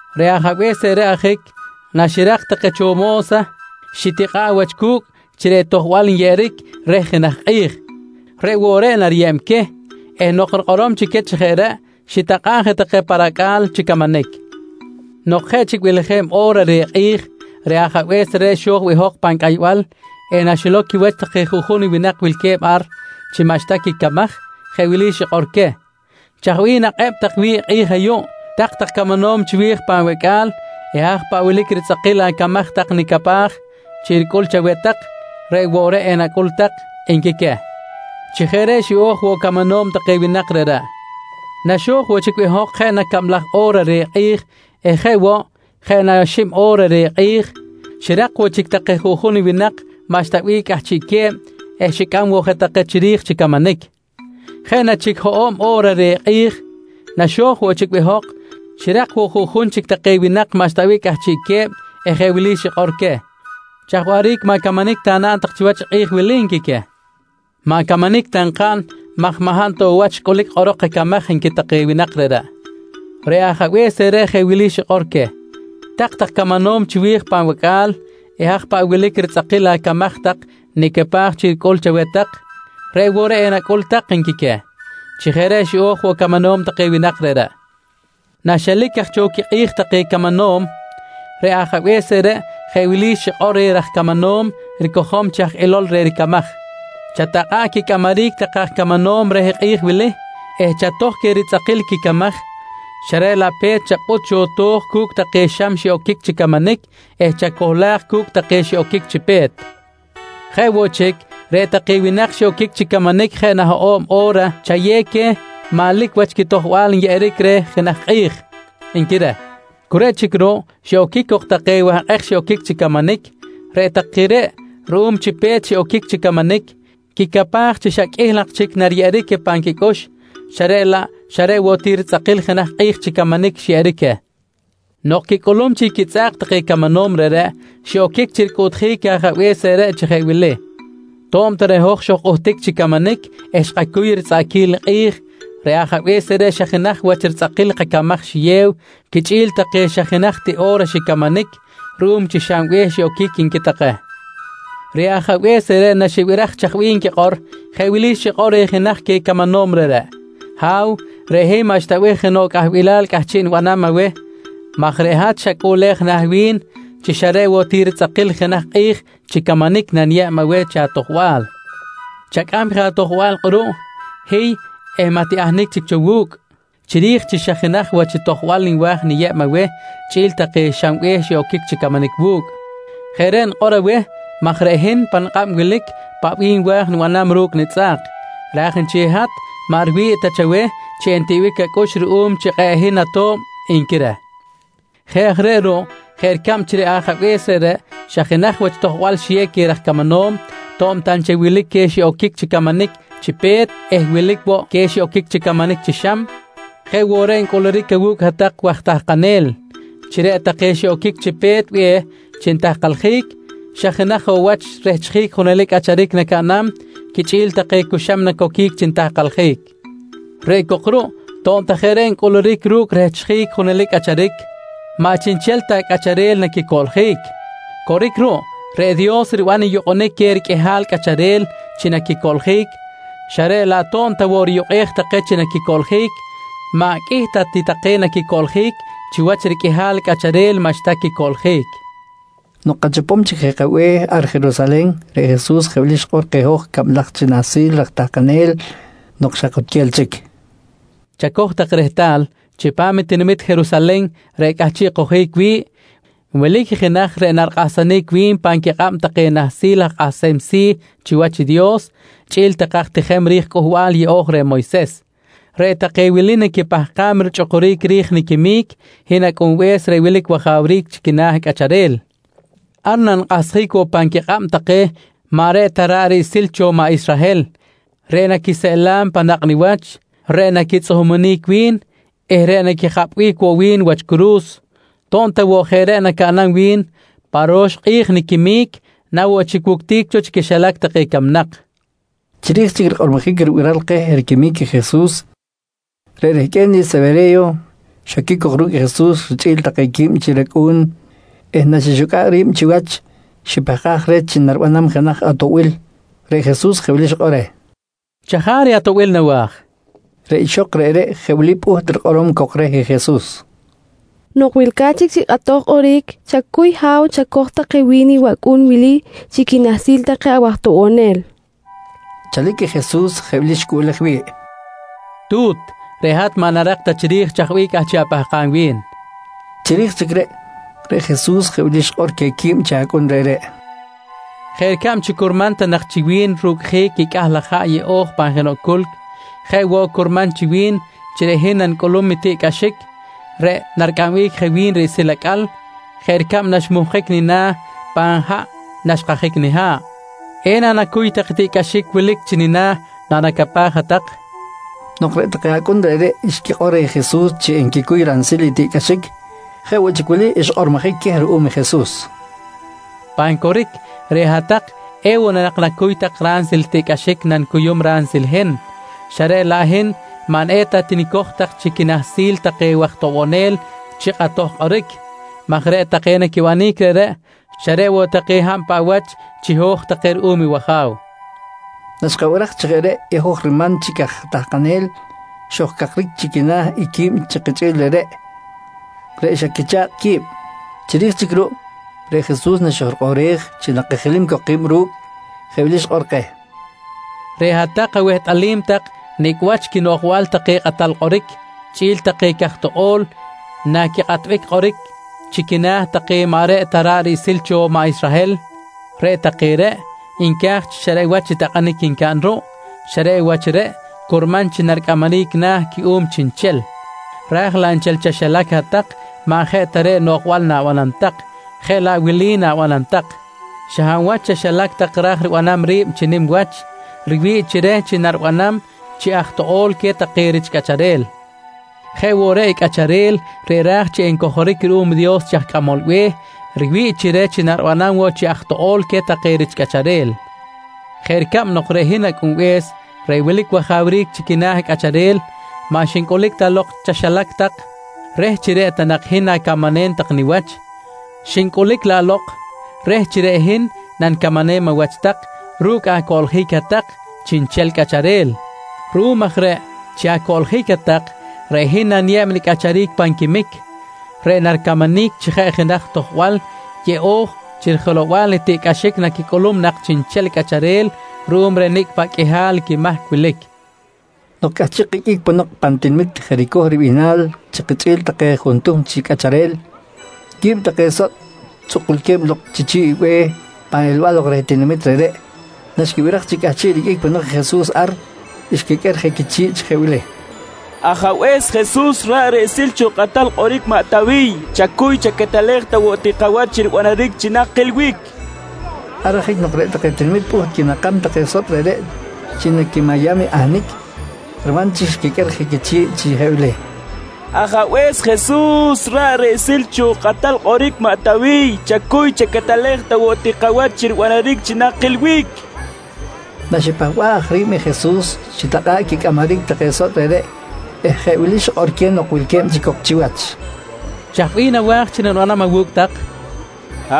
Reꞌ ajabe̱s reꞌreꞌ ajic naxirak take cho mo̱sa, xitikꞌa̱ꞌ wach cu̱cꞌ chi reꞌ tojbal nyeꞌeric reh jenaj kꞌi̱j, reꞌ woꞌ reꞌ nariyeb queh eh nok rikꞌorom chic queh chi jeꞌ reꞌ, xitakꞌa̱ꞌ je take pa racꞌa̱l chi camanic. Nok jeꞌ chic beleje̱b o̱ra reh kꞌi̱j, reꞌ ajabe̱s reꞌreꞌ xo̱j behok pan cꞌaybal eh naxilow quiwach take juꞌjun winak wilque̱b ar chi maꞌxta quicamaj jeꞌ wili xikꞌor queh: ‹Chaj bih nakꞌeb tak wi̱ꞌ i kꞌi̱j ayuꞌ, tak-tak camanom chiwi̱j pan wacꞌa̱l eh haj paꞌ wilic ritzꞌakil acamaj tak nicapaj chi ricꞌul chaweh tak reꞌ woꞌ reꞌ enacꞌul tak, nqui queh. «Chi jeꞌ reꞌ, xiꞌo̱j woꞌ camanom take winak reꞌreꞌ. «Naxo̱j woꞌ chic behok jeꞌ na cablaj o̱ra reh kꞌi̱j eh jeꞌ woꞌ, jeꞌ na xib o̱ra reh kꞌi̱j, xirak woꞌ chic take juꞌjun winak maꞌxta bih cꞌahchiꞌque̱b eh xicꞌam woꞌ je take chiri̱j chi camanic. Jeꞌ na chic hoꞌo̱b o̱ra reh kꞌi̱j naxo̱j woꞌ chic behok, xirak woꞌ juꞌjun chic take winak maꞌxta bih cꞌahchiꞌque̱b eh jeꞌ wili xikꞌor queh: ‹Chaj waꞌric maꞌ camanic ta naꞌn tak chiwach i kꞌi̱j wili? nqui queh. —Maꞌ camanic ta nkaꞌn maj maꞌ hab ta woꞌ wach ncꞌulic kꞌorok kacamaj, nqui take winak reꞌreꞌ. «Reꞌ ajabe̱s reꞌreꞌ jeꞌ wili xikꞌor queh: ‹Tak-tak camanom chiwi̱j pan wacꞌa̱l eh haj paꞌ wilic ritzꞌakil acamaj tak nicapaj chi ricꞌul chaweh tak, reꞌ woꞌ reꞌ enacꞌul tak, nqui queh. «Chi jeꞌ reꞌ xiꞌo̱j woꞌ camanom take winak reꞌreꞌ. Naxelic aj cho quikꞌi̱j take camanom, reꞌ ajabe̱s reꞌreꞌ jeꞌ wili xikꞌor reh raj camanom ricojom chi aj ilol reh ricamaj: ‹Chatakꞌa̱ꞌ quicꞌamaric take aj camanom reh kꞌi̱j wili eh chatoj queh ritzꞌakil quicamaj, xa reꞌ laꞌ pe̱t chapꞌut cho to̱j cu̱cꞌ take xam xiꞌoquic chi camanic eh chacohlaj cu̱cꞌ take xiꞌoquic chi pe̱t. Jeꞌ woꞌ chic, reꞌ take winak xiꞌoquic chi camanic jeꞌ na hoꞌo̱b o̱ra chayew queh manlic wach tojbal nyeꞌeric reh jenaj kꞌi̱j, nqui reh. «Cu reꞌ chic ruꞌ, xiꞌoquic cok take wahkꞌek xiꞌoquic chi camanic. Reꞌ take reꞌ ruꞌum chi pe̱t xiꞌoquic chi camanic quicapaj chi xa qꞌuih laꞌ chic nariyeꞌeric queh pan quicꞌux, xa reꞌ laꞌ xa reꞌ woꞌ ti ritzꞌakil i jenaj kꞌi̱j chi camanic xyeꞌeric queh. Nok quicꞌulum chic quitzꞌa̱k take camanom reꞌreꞌ, xiꞌoquic chi ricꞌuꞌtjic i ajabe̱s reꞌreꞌ chi jeꞌ wili: ‹To̱b ta reꞌ hoj xojkꞌuhtic chi camanic eh xkacuy ritzꞌaꞌquil i kꞌi̱j, reꞌ ajabe̱s reꞌreꞌ xa jenaj wach ritzꞌakil kacamaj xiyew quichꞌi̱l take xa jenaj ti o̱ra xicamanic ruꞌum chi xam be̱h xiꞌoquic, nqui take. «Reꞌ Ajabe̱s reꞌreꞌ naxibiraj i chaj bih nquikꞌor, jeꞌ wili xikꞌor reh jenaj queh camanom reꞌreꞌ: ‹Ha̱w, reꞌ hin maꞌxta bih jenoꞌ cꞌahbilal cꞌahchiꞌ nibanam aweh maj reꞌ hat xacꞌuꞌlej na̱ wi̱n chi xa reꞌ woꞌ ritzꞌakil i jenaj kꞌi̱j chi camanic naniyeb aweh chi atojbal. Chacꞌam je atojbal kꞌuruꞌ, hiy eh maꞌ tiꞌahnic chic cho wu̱cꞌ chiri̱j chi xa jenaj wach tojbal nwa̱j niyeb aweh chꞌi̱l take xam be̱h xiꞌoquic chi camanic wu̱cꞌ. Jeꞌ reꞌ nikꞌor aweh maj reꞌ hin pa nikꞌab wilic i paꞌ bih nwa̱j nibanam ru̱cꞌ nitzꞌa̱k, raj nchel i hat maꞌ riwi̱ꞌ ta chaweh chi entiꞌbic acꞌux ruꞌum chi kꞌe̱ꞌ hin ato̱b, nqui reh. «Jeꞌ aj reꞌ ruꞌ, jeꞌ ricab chi reꞌ ajabe̱s reꞌreꞌ xa jenaj wach tojbal xiyew queh raj camanom, to̱b ta nchel wilic queh xiꞌoquic chi camanic chi pe̱t eh wilic woꞌ queh xiꞌoquic chi camanic chi xam, jeꞌ woꞌ reꞌ ncꞌuluric awu̱cꞌ hat-tak waj tahkanel chi reꞌ take xiꞌoquic chi pe̱t be̱h chi nitahkaljic, xa jenaj woꞌ wach rehchjic i junelic cꞌacharic nacaꞌnam quichꞌi̱l take cu xam nacoquic chi nitahkaljic. Reꞌ cok ruꞌ to̱b ta jeꞌ reꞌ ncꞌuluric ru̱cꞌ rehchjic i junelic cꞌacharic, maꞌ chiꞌnchel ta take cꞌacharel naquicoꞌljic. Coric ruꞌ, reꞌ Dios riban i yukꞌunic queh riqꞌuihal cꞌacharel chi naquicoꞌljic, xa reꞌ laꞌ to̱b ta woꞌ riyukꞌej take chi naquicoꞌljic, maꞌ qꞌuih ta ti take naquicoꞌljic chiwach i riqꞌuihal cꞌacharel maꞌxta quicoꞌljic, nqui Jesus reh maꞌ Luch. Nok kachopom chic je kabe̱h ar Jerusalen, reꞌ Jesus jeꞌ wili xikꞌor keh hoj cablaj chi nahsil raj tahkanel nok xa kutquel chic: «Chacoj tak rehtal, chipam i tinamit Jerusalen reꞌ cꞌahchiꞌ kojic wi̱ꞌ wilic i jenaj reꞌ narikꞌahsjic wi̱n pan quikꞌab take nahsil aj kꞌahsem si̱ chiwach i Dios chꞌi̱l take aj tijem ri̱j Cꞌuhbal Yeꞌo̱j reh Moyses. Reꞌ take wili naquipahkam richꞌukuric ri̱j niquimic i hin Acꞌunbe̱s reꞌ wilic wajawric chi quina̱ cꞌacharel. Ar nanikꞌahsjic woꞌ pan quikꞌab take maꞌ reꞌ ta ra̱ꞌ riꞌsil cho maꞌ Israhel, reꞌ naquiseꞌlam pan nakꞌ niwach, reꞌ naquitzꞌuhumunic wi̱n eh reꞌ naquijapꞌbic woꞌ wi̱n wach curu̱s. To̱b ta woꞌ jeꞌ reꞌ nacaꞌnam wi̱n, pa ro̱x kꞌi̱j niquimic na woꞌ chic wuctic cho chi quixilac take camnak, nqui keh. Chiri̱j chic rikꞌormojic ribiral keh riquimic i Jesus, reꞌ rehqꞌue̱n i Sewere̱yo xoquic cok ru̱cꞌ i Jesus richꞌi̱l take quib chi racꞌu̱n eh naxixucꞌa̱ꞌ ri̱b chiwach, xipahkaj reh chi naribanam jenaj atoꞌbil. Reꞌ Jesus jeꞌ wili xikꞌor reh: «Chajaric i atoꞌbil nawa̱j, nqui reh. Reꞌ ixok reꞌreꞌ, jeꞌ wili pꞌuht rikꞌorom cok reh Jesus: «Nok wilca̱t chic chi kꞌatoj kꞌoric, chacuy Ha̱w chacoj ta take wi̱n i wacꞌu̱n wili chi quinahsil take awaj toꞌbonel, nqui reh. Chalic i Jesus jeꞌ wili xicꞌuꞌlej wi̱ꞌ: «Tu̱t, reꞌ hat maꞌ narak ta chiri̱j chaj bih cꞌahchiꞌ apahkam wi̱n, nqui reh. Chiri̱j chic reꞌ, reꞌ Jesus jeꞌ wili xikꞌor queh quib chi acꞌun reꞌreꞌ: «Jeꞌ ricab chi curman ta nak chi wi̱n rucꞌjic i cꞌah laj haꞌ yeꞌo̱j pan jenoꞌ culc, jeꞌ woꞌ curman chi wi̱n chi reꞌ hin nanicꞌulum i tiꞌcꞌaxic reꞌ naricꞌambic je wi̱n riꞌsil acꞌal jeꞌ ricab naxmuhkic nina̱ pan haꞌ naxkahsjic niha̱ꞌ. Ena nacuy tak i tiꞌcꞌaxic wilic chi nina̱ nanacapaj hat-tak? nqui queh. Nok reꞌ take acꞌun reꞌreꞌ xquikꞌor reh Jesus chi enquicuy ransil i tiꞌcꞌaxic, jeꞌ woꞌ chic wili xkꞌormojic queh ruꞌum i Jesus: «Pan coric, reꞌ hat-tak ewoꞌ na nak nacuy tak ransil i tiꞌcꞌaxic nanicuyum ransil i hin, xa reꞌ laꞌ hin maꞌ eta tinicoj tak chi quinahsil take waj toꞌbonel chi kꞌatoj kꞌoric maj reꞌ take naquibanic reꞌreꞌ, xa reꞌ woꞌ take hab paꞌ wach chiho̱j take ruꞌum i wAja̱w, nqui Jesus queh. Naxkabiraj chi jeꞌ reꞌ i hoj riman chic aj tahkanel, xojcakric chi quina̱ i quib i kichꞌi̱l reꞌreꞌ, reꞌ xa quicha̱kꞌ qui̱b. Chiri̱j chic ruꞌ, reꞌ Jesus naxojrikꞌoꞌrej chi nakajilim cok ki̱b ru̱cꞌ, jeꞌ wili xikꞌor keh: «Reꞌ hat-tak awehtꞌalim tak nicꞌ wach quinoꞌjbal take kꞌatal kꞌoric chꞌi̱l take caj toꞌo̱l naquikꞌatbic kꞌoric chi quina̱ take maꞌ reꞌ ta ra̱ꞌ riꞌsil cho maꞌ Israhel. Reꞌ take reꞌ nca̱j chi xa reꞌ wach i takꞌanic ncaꞌn ruꞌ, xa reꞌ wach reꞌ curman chi naricꞌamaric na̱ cuꞌum chiꞌnchel, ra̱j laꞌ nchel chaxilac hat-tak maꞌ jeꞌ ta reꞌ noꞌjbal na̱banam tak, jeꞌ laꞌ wili na̱banam tak: Xa hab wach chaxilac tak ra̱j ribanam ri̱b chi nim wach, riwi̱ꞌ chi reh chi naribanam chi aj toꞌo̱l queh take rich cꞌacharel. Jeꞌ woꞌ reꞌ i cꞌacharel reꞌ ra̱j chi encojoric ruꞌum i Dios chi aj cꞌamol be̱h, riwi̱ꞌ chi reh chi naribanam woꞌ chi aj toꞌo̱l queh take rich cꞌacharel jeꞌ ricab nok reꞌ hin Acꞌunbe̱s reꞌ wilic wajawric chi quina̱ cꞌacharel, maꞌ xincꞌulic ta lok chaxilac tak reh chi reꞌ ta nak hin na̱camanem tak niwach, xincꞌulic laꞌ lok reh chi reꞌ hin nanicamanem awach tak ru̱cꞌ acoꞌljic hat-tak chiꞌnchel cꞌacharel. Ruꞌum aj reꞌ chi acoꞌljic hat-tak, reꞌ hin naniyeb nicꞌacharic pan quimic reꞌ naricamanic chi jeꞌ jenaj tojbal yeꞌo̱j chi rijelow-bal i tiꞌcꞌaxic naquicꞌulum nak chiꞌnchel cꞌacharel ruꞌum reh nicꞌ paꞌ qꞌuihal quimahc wilic, nqui Jesus keh. Nok cꞌahchiꞌ kiqꞌuic ponok pan tinamit Jericoh ribihnal chi kichꞌi̱l take juntuhm chi cꞌacharel, quib take sotꞌ tzꞌukulque̱b lok chi chi̱ꞌ i be̱h pan elbal lok reh tinamit reꞌreꞌ, naxquibiraj chi cꞌahchiꞌ riqꞌuic ponok i Jesus ar xquiqꞌuer je quichi̱ꞌ chi jeꞌ wili: «Ajabe̱s Jesus ra̱ꞌ riꞌsil cho kꞌatal kꞌoric maꞌ Tawiy, chacuy chaquetelej ta woꞌ ti kawach chi ribanaric chi nakilbic, nqui take reh. Ar ajic nok reꞌ take tinamit pꞌuht quinakam take sotꞌ reꞌreꞌ chi naquimayam ahnic, riman chic xquiqꞌuer je quichi̱ꞌ chi jeꞌ wili: «Ajabe̱s Jesus ra̱ꞌ riꞌsil cho kꞌatal kꞌoric maꞌ Tawiy, chacuy chaquetelej ta woꞌ ti kawach chi ribanaric chi nakilbic, nqui take reh. Naxipahba̱ꞌ aj ri̱b i Jesus, xitakꞌa̱ꞌ quicꞌamaric take sotꞌ reꞌreꞌ eh jeꞌ wili xikꞌor queh nok wilque̱b chic cok chiwach: «Chaj bih nawa̱j tak chi nanibanam awu̱cꞌ tak? nqui queh.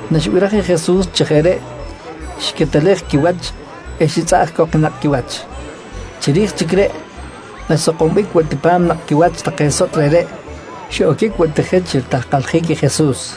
Naxibiraj i Jesus chi jeꞌ reꞌ, xiquetelej quiwach eh xitzꞌaꞌj cok i nakꞌ quiwach. Chiri̱j chic reꞌ, naxsakombic woꞌ ti pa̱m nakꞌ quiwach take sotꞌ reꞌreꞌ, xiꞌoquic woꞌ ti je chi ritahkaljic i Jesus.